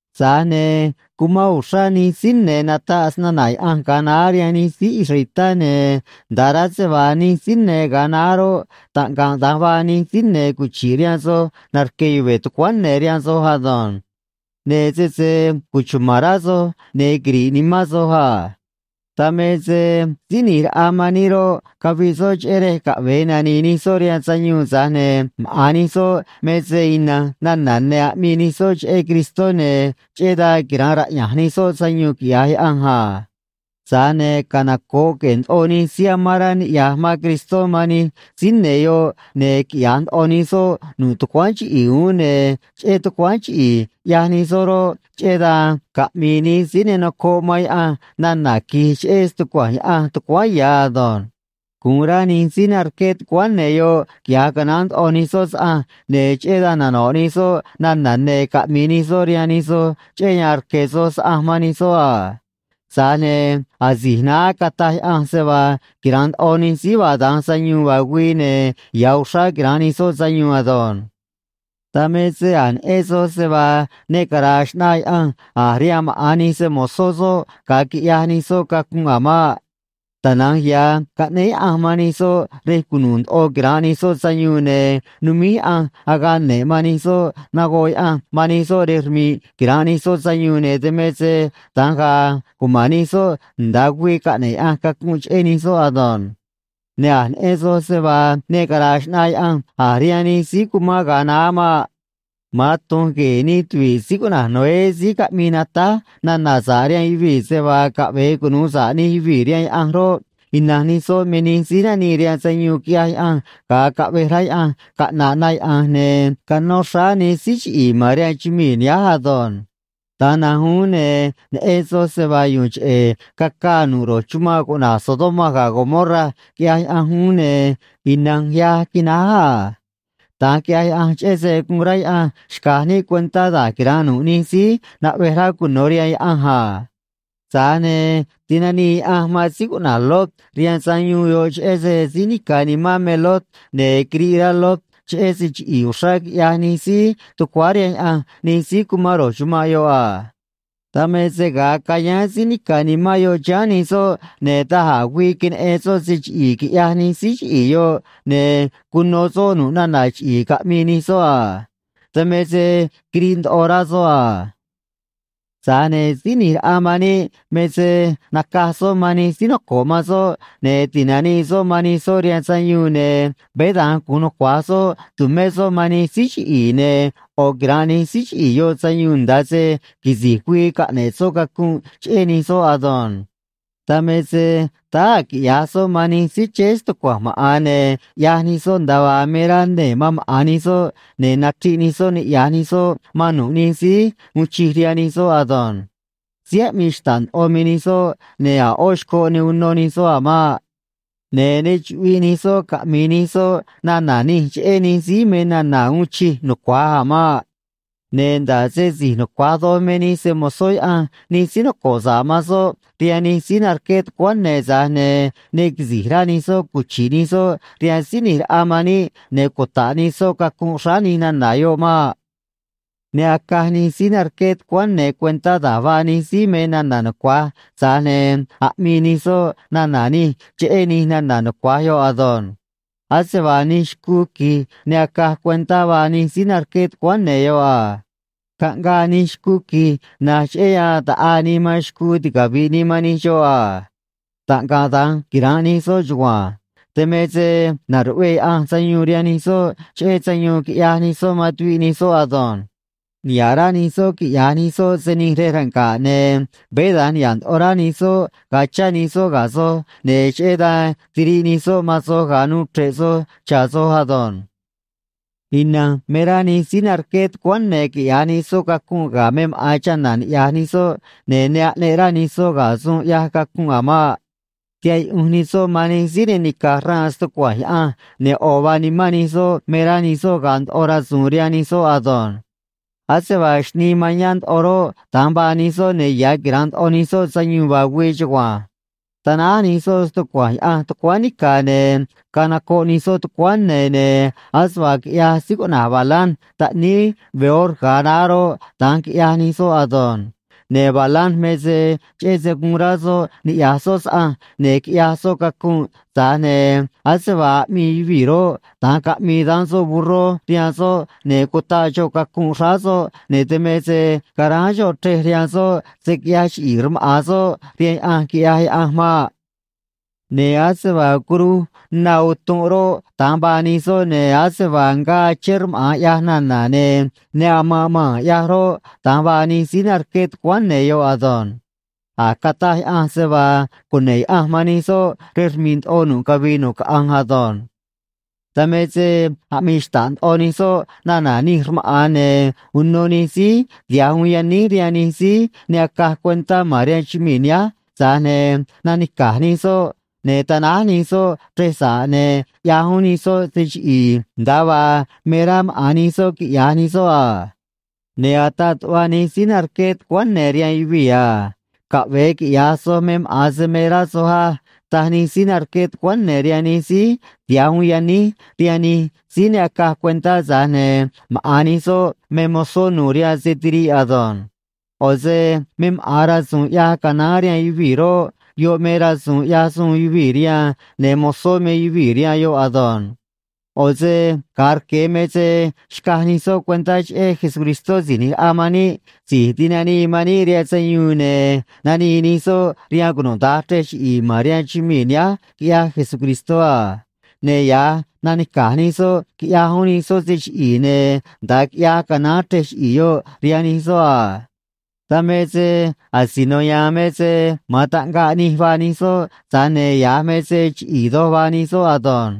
Tza̱j ne̱ cumán uxrá nij síí ne̱ nataꞌ snana̱ Yaꞌanj ga̱a naá rihaan nij síí israelitá, ne̱ nda̱a rá se vaa nij síí ne̱ ga̱a naá roꞌ, taꞌngaꞌ da̱nj vaa nij síí ne̱ cuchi̱ꞌ rihaan soj narque̱ yuve̱ tucuáán ne̱ rihaan soj ado̱nj. Ne̱ sese cuchuma̱n rá soj, ne̱ quiri̱ꞌ nimán soj a. Dan me se Síí ꞌNi̱j Raꞌa man níꞌ roꞌ, caviꞌ soꞌ cheꞌé rej caꞌve̱e nani̱i̱ nij soꞌ rihaan sayuun, tza̱j ne̱ maꞌa̱n nij soꞌ me se ina̱nj nana̱ ne̱ aꞌmii nij soꞌ cheꞌé Cristó, ne̱ cheꞌé dan quira̱nꞌ raꞌya̱nj ya̱ nij soꞌ sayuun, quiꞌya̱j Yaꞌanj a. Tza̱j ne̱ canoco̱ꞌ queꞌe̱e̱ ndoꞌo nij síí amán rá niꞌya̱j man Cristó man nij síí ne̱ yoꞌ, ne̱ quiꞌya̱j ndoꞌo nij soꞌ nu̱ꞌ tucuáán chiꞌi̱i̱ uún, ne̱ cheꞌé tucuáán chiꞌi̱i̱ ꞌyaj nij soꞌ roꞌ, cheꞌé dan caꞌmi̱i̱ nij síí ne nocoꞌ man Yaꞌanj nana̱ qui̱j cheꞌé stucua̱nj Yaꞌanj tucuáán ya̱ ado̱nj. Gu̱un rá nij síí narque̱ tucuáán ne̱ yoꞌ quiꞌya̱j canaán ndoꞌo nij soꞌ saꞌanj, ne̱ cheꞌé dan nano̱ꞌ nij soꞌ nana̱ ne̱ caꞌmi̱i̱ nij soꞌ rihaan nij soj cheꞌé yan rque̱ soj saꞌanj man nij soꞌ a. Tza̱j ne̱ asi̱j naá cataj Yaꞌanj se vaa quira̱nꞌ ndoꞌo nij síí vaa da̱nj sayuun vaa güii, ne̱ ya̱ uxrá quira̱nꞌ nij soꞌ sayuun ado̱nj. Dan me se a̱j neꞌen soj se vaa ne cara̱a̱ xꞌnaa Yaꞌanj a̱ rihaan maꞌa̱n nij se‑mo̱zó soꞌ ga̱a quiꞌyaj nij soꞌ cacunꞌ a̱ maꞌ. Tana̱nj ya̱ caꞌnéé Yaꞌanj man nij soꞌ rej cunu̱u̱ ndoꞌo quira̱nꞌ nij soꞌ sayuun, ne̱ numíj Yaꞌanj agaꞌ ne̱ꞌ man nij soꞌ, nagoꞌ Yaꞌanj man nij soꞌ rej rmi̱ꞌ quira̱nꞌ nij soꞌ sayuun, ne̱ dan me se da̱nj ga̱a̱ cuma̱n nij soꞌ nda̱a güii caꞌne̱ꞌ Yaꞌanj cacunꞌ cheꞌé nij soꞌ ado̱nj. Ne̱ a̱j neꞌen soj se vaa ne cara̱a̱ xꞌnaa Yaꞌanj a̱ rihaan nij síí cumán ga̱a naá maꞌ. Ma̱an tu̱nj gue̱e̱ nij tuvi̱ꞌ síí cuꞌna̱j Noé síí caꞌmii natáj nana̱ sa̱ꞌ rihaan yuvii̱ se vaa caꞌve̱e cunu̱u sa̱ꞌ nij yuvii̱ rihaan Yaꞌanj roꞌ, ina̱nj nij soꞌ me nij síí nanii rihaan sayuun quiꞌyaj Yaꞌanj, ga̱a caꞌvej rá Yaꞌanj caꞌna̱ꞌ na yaꞌa̱nj, ne̱ canó xráá nij síí chiꞌi̱i̱ ma̱n rihaan chumii̱ nihánj ado̱nj. Da̱nj na̱nj uún, ne̱ neꞌen soj se vaa yu̱u̱n cheꞌe̱ cacaa nu̱ꞌ ro̱j chumanꞌ cuꞌna̱j Sodoma ga̱ Gomorra, quiꞌyaj Yaꞌanj uún, ne̱ ina̱nj yaj quináj a. Da̱nj quiꞌyaj Yaꞌanj cheꞌé se guun rá Yaꞌanj xca̱j níꞌ cuentá da̱j quira̱nꞌ nu̱ꞌ nij síí naꞌvej rá cuno̱ rihaan Yaꞌanj a. Tza̱j ne̱ tinanii Yaꞌanj man síí cuꞌna̱j Lot rihaan sayuun yoꞌ, cheꞌé se síí nica̱ nimán me Lot, ne̱ quiriꞌ rá Lot cheꞌé se chiꞌi̱i̱ uxrá quiꞌyaj nij síí tucuáá rihaan Yaꞌanj nij síí cumán ro̱j chumanꞌ yoꞌ a. Dan me se ga̱a cayáán síí nica̱ nimán yoꞌ chiháán nij soꞌ, ne̱ da̱j a̱ güii queneꞌen soꞌ se chiꞌi̱i̱ quiꞌyaj nij síí chiꞌi̱i̱ yoꞌ, ne̱ cuno soꞌ nu̱ꞌ nana̱ chiꞌi̱i̱ caꞌmii nij soꞌ a. Dan me se quiriꞌ ndoꞌo rá soꞌ a. Tza̱j ne̱ Síí ꞌNi̱j Raꞌa man níꞌ me se nacaj soꞌ man nij síí noco̱ꞌ man soꞌ, ne̱ ti̱nanii soꞌ man nij soꞌ rihaan sayuun, ne̱ veé da̱nj gu̱un nucua̱j soꞌ tu̱mé soꞌ man nij síí chiꞌi̱i̱, ne̱ ꞌo̱ quira̱nꞌ nij síí chiꞌi̱i̱ yoꞌ sayuun nda̱a se quisi̱j güii caꞌne̱ꞌ soꞌ cacunꞌ cheꞌé nij soꞌ ado̱nj. Dan me se táá a̱ quiꞌya̱j soꞌ man nij síí chéé stucua̱nj maꞌa̱n, ne̱ ꞌyaj nij soꞌ nda̱a vaa me rá nee̱ man maꞌa̱n nij soꞌ, ne̱ nachriꞌ nij soꞌ niꞌya̱j nij soꞌ man nu̱ꞌ nij síí uun chij rihaan nij soꞌ ado̱nj. Síí aꞌmii xta̱ꞌ ndoꞌo me nij soꞌ, ne̱ a̱ ꞌó xcoꞌ ne uno nij soꞌ a̱ maꞌ. Ne̱ ne chuꞌviꞌ nij soꞌ caꞌmi̱i̱ nij soꞌ nana̱ nij cheꞌé nij síí me nana̱ uun chij nucua̱j a̱ maꞌ. Ne̱ nda̱ꞌ se si̱j nucua̱j doj me nij se‑mo̱zó Yaꞌanj nij síí noco̱ꞌ sa̱ꞌ man soꞌ rihaan nij síí narqué tucuáán ne̱, tza̱j ne̱ ne quisi̱j rá nij soꞌ cuchi̱ꞌ nij soꞌ rihaan Síí ꞌNi̱j Raꞌa man níꞌ ne̱ cuta̱ꞌ nij soꞌ cacunꞌ xráá nij nana̱ yoꞌ maꞌ. Ne acaj nij síí narqué tucuáán ne̱ cuentá da̱j vaa nij síí me nana̱ nucua̱j, tza̱j ne̱ aꞌmii nij soꞌ nana̱ nij cheꞌé nij nana̱ nucua̱j yoꞌ ado̱nj. Ase vaa nij xcuu qui̱j ne acaj cuentá vaa nij síí narqué tucuáán ne̱ yoꞌ a. Caꞌngaa nij xcuu qui̱j, na̱nj cheꞌé yan ta̱ꞌaa nii man xcuu ticavi̱ꞌ nii man nij xoꞌ a. Taꞌngaꞌ da̱nj quira̱nꞌ nij soꞌ chugua̱nj. Dan me se na̱ruꞌvee Yaꞌanj sayuun rihaan nij soꞌ cheꞌé sayuun quiꞌyaj nij soꞌ man tuviꞌ nij soꞌ ado̱nj. Niha̱ꞌ rá nij soꞌ quiꞌya̱j nij soꞌ se nij rej ranga̱ꞌ, ne̱ veé da̱nj niha̱ꞌ ndoꞌo rá nij soꞌ ga̱a chá nij soꞌ ga̱ soj, ne̱ cheꞌé dan tiriꞌ nij soꞌ man soj ga̱a nuu chre̱ꞌ soj cha̱ soj ado̱nj. Ina̱nj me rá nij síí narqué tucuáán ne̱ quiꞌya̱j nij soꞌ cacunꞌ ga̱ me maꞌa̱n chana̱ ni̱ꞌyaj nij soꞌ, ne̱ ne aꞌneꞌ rá nij soꞌ ga̱ suun ꞌyaj cacunꞌ a̱ maꞌ. Tihaꞌ yuꞌunj nij soꞌ man nij síí ne nica̱j xraan stucua̱nj Yaꞌanj, ne̱ ꞌo̱ vaa nimán nij soꞌ me rá nij soꞌ ga̱a̱ ndoꞌo rasu̱u̱n rihaan nij soꞌ ado̱nj. Ase vaa xnii mañá ndoꞌo roꞌ, da̱nj vaa nij soꞌ, ne̱ ya̱ quira̱nꞌ ndoꞌo nij soꞌ sayuun vaa güii chugua̱nj. Tanáj nij soꞌ stucua̱nj Yaꞌanj tucuáán nica̱, ne̱ canocoꞌ nij soꞌ tucuáán ne̱, ne̱ ase vaa quiꞌyaj síí cuꞌna̱j Balaam taꞌníí Beor ga̱a naá roꞌ, da̱nj quiꞌyaj nij soꞌ ado̱nj. Ne̱ Balaam me se cheꞌé se guun rá soꞌ niꞌya̱j soꞌ saꞌanj, ne̱ quiꞌyaj soꞌ cacunꞌ, tza̱j ne̱ ase vaa aꞌmii yuvii̱ roꞌ, da̱nj caꞌmii daán soꞌ burró rihaan soꞌ, ne̱ cutaꞌ xoꞌ cacunꞌ xráá soꞌ, ne̱ dan me se caráán xoꞌ chrej rihaan soꞌ se̱ quiꞌyaj chiꞌi̱i̱ rmaꞌa̱n soꞌ rihaan Yaꞌanj, quiꞌyaj Yaꞌanj maꞌ. Ne̱ ase vaa curuj na utunꞌ roꞌ, da̱nj vaa nij soꞌ, ne̱ ase vaa ngaa achén rmaꞌa̱n ꞌyaj nana̱ ne̱ ne amanꞌ maa̱n ꞌyaj roꞌ, da̱nj vaa nij síí narqué tucuáán ne̱ yoꞌ ado̱nj. A̱j cataj Yaꞌanj se vaa cune̱ꞌ Yaꞌanj man nij soꞌ rej rmi̱ꞌ ndoꞌo nu̱ꞌ cavii nu̱ꞌ caꞌanj ado̱nj. Dan me se aꞌmii xta̱ꞌ ndoꞌo nij soꞌ nana̱ nij rmaꞌa̱n, ne̱ uno nij síí tiha̱j uun yaníj rihaan nij síí ne acaj cuentá ma̱n rihaan chumii̱ nihánj, tza̱j ne̱ nanica̱j nij soꞌ, ne̱ tanáj nij soꞌ chrej sa̱ꞌ, ne̱ ꞌyaj uún nij soꞌ se chiꞌi̱i̱ nda̱a vaa me rá maꞌa̱n nij soꞌ quiꞌya̱j nij soꞌ a. Ne̱ ataꞌ tuꞌva nij síí narqué tucuáán ne̱ rihaan yuvii̱ a: “Caꞌve̱e quiꞌya̱j soj me maꞌa̱n se me rá soj á”, taj nij síí narqué tucuáán ne̱ rihaan nij síí tiha̱j uun yaníj rihaan nij síí ne acaj cuentá, tza̱j ne̱ maꞌa̱n nij soꞌ me mozó nu̱u̱ rihaan se tiriꞌ ado̱nj. ꞌO̱ se me maꞌa̱n rasu̱u̱n ꞌyaj canaán rihaan yuvii̱ roꞌ, yoꞌ me rasu̱u̱n ꞌyaj suun yuvii̱ rihaan, ne̱ mozó me yuvii̱ rihaan yoꞌ ado̱nj. ꞌO̱ se ga̱a rque̱ me se xcaj nij soꞌ cuentá cheꞌé Jesucristó Si̱j ꞌNi̱j Raꞌa man níꞌ, Si̱j Tinanii man níꞌ rihaan Sayuun, ne̱ nanii nij soꞌ rihaan cunuda̱nj chrej chiꞌi̱i̱ ma̱n rihaan chumii̱ nihánj, quiꞌyaj Jesucristó a. Ne̱ ya̱j nanica̱j nij soꞌ quiꞌyaj uún nij soꞌ se chiꞌi̱i̱, ne̱ nda̱a quiꞌyaj canaán chrej chiꞌi̱i̱ yoꞌ rihaan nij soꞌ a. Dan me se asino ya̱a̱n me se ma̱an taꞌngaꞌ nij vaa nij soꞌ, tza̱j ne̱ ya̱j me se chiꞌi̱i̱ doj vaa nij soꞌ ado̱nj.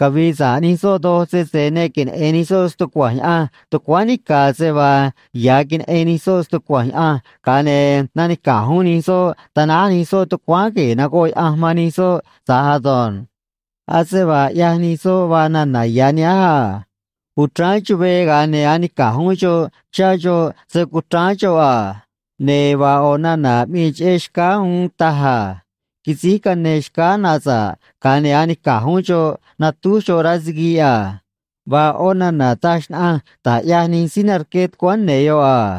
Cavi̱i̱ sa̱ꞌ nij soꞌ doj sese ne queneꞌe̱n nij soꞌ stucua̱nj Yaꞌanj tucuáán nica̱ se vaa ya̱j queneꞌen nij soꞌ stucua̱nj Yaꞌanj, ga̱a ne̱ nanica̱j uún nij soꞌ tanáj nij soꞌ tucuáán gue̱e̱ nagoꞌ Yaꞌanj man nij soꞌ tza̱j ado̱nj. Ase vaa ꞌyaj nij soꞌ vaa nana̱ ya̱ nihánj a: “Uchráán chuvee, ga̱a ne̱ anica̱j uún xoꞌ chá xoꞌ se cuchráán xoꞌ a”, ne̱ vaa ꞌo̱ nana̱ aꞌmii cheꞌé xcáá uún taj a: “Quisíj cane xcáá na sa̱ꞌ, ga̱a ne̱ anica̱j uún xoꞌ natúj xoꞌ rá siguiꞌ a”, vaa ꞌó nana̱ taj xnaꞌanj da̱j ꞌyaj nij síí narqué tucuáán ne̱ yoꞌ a.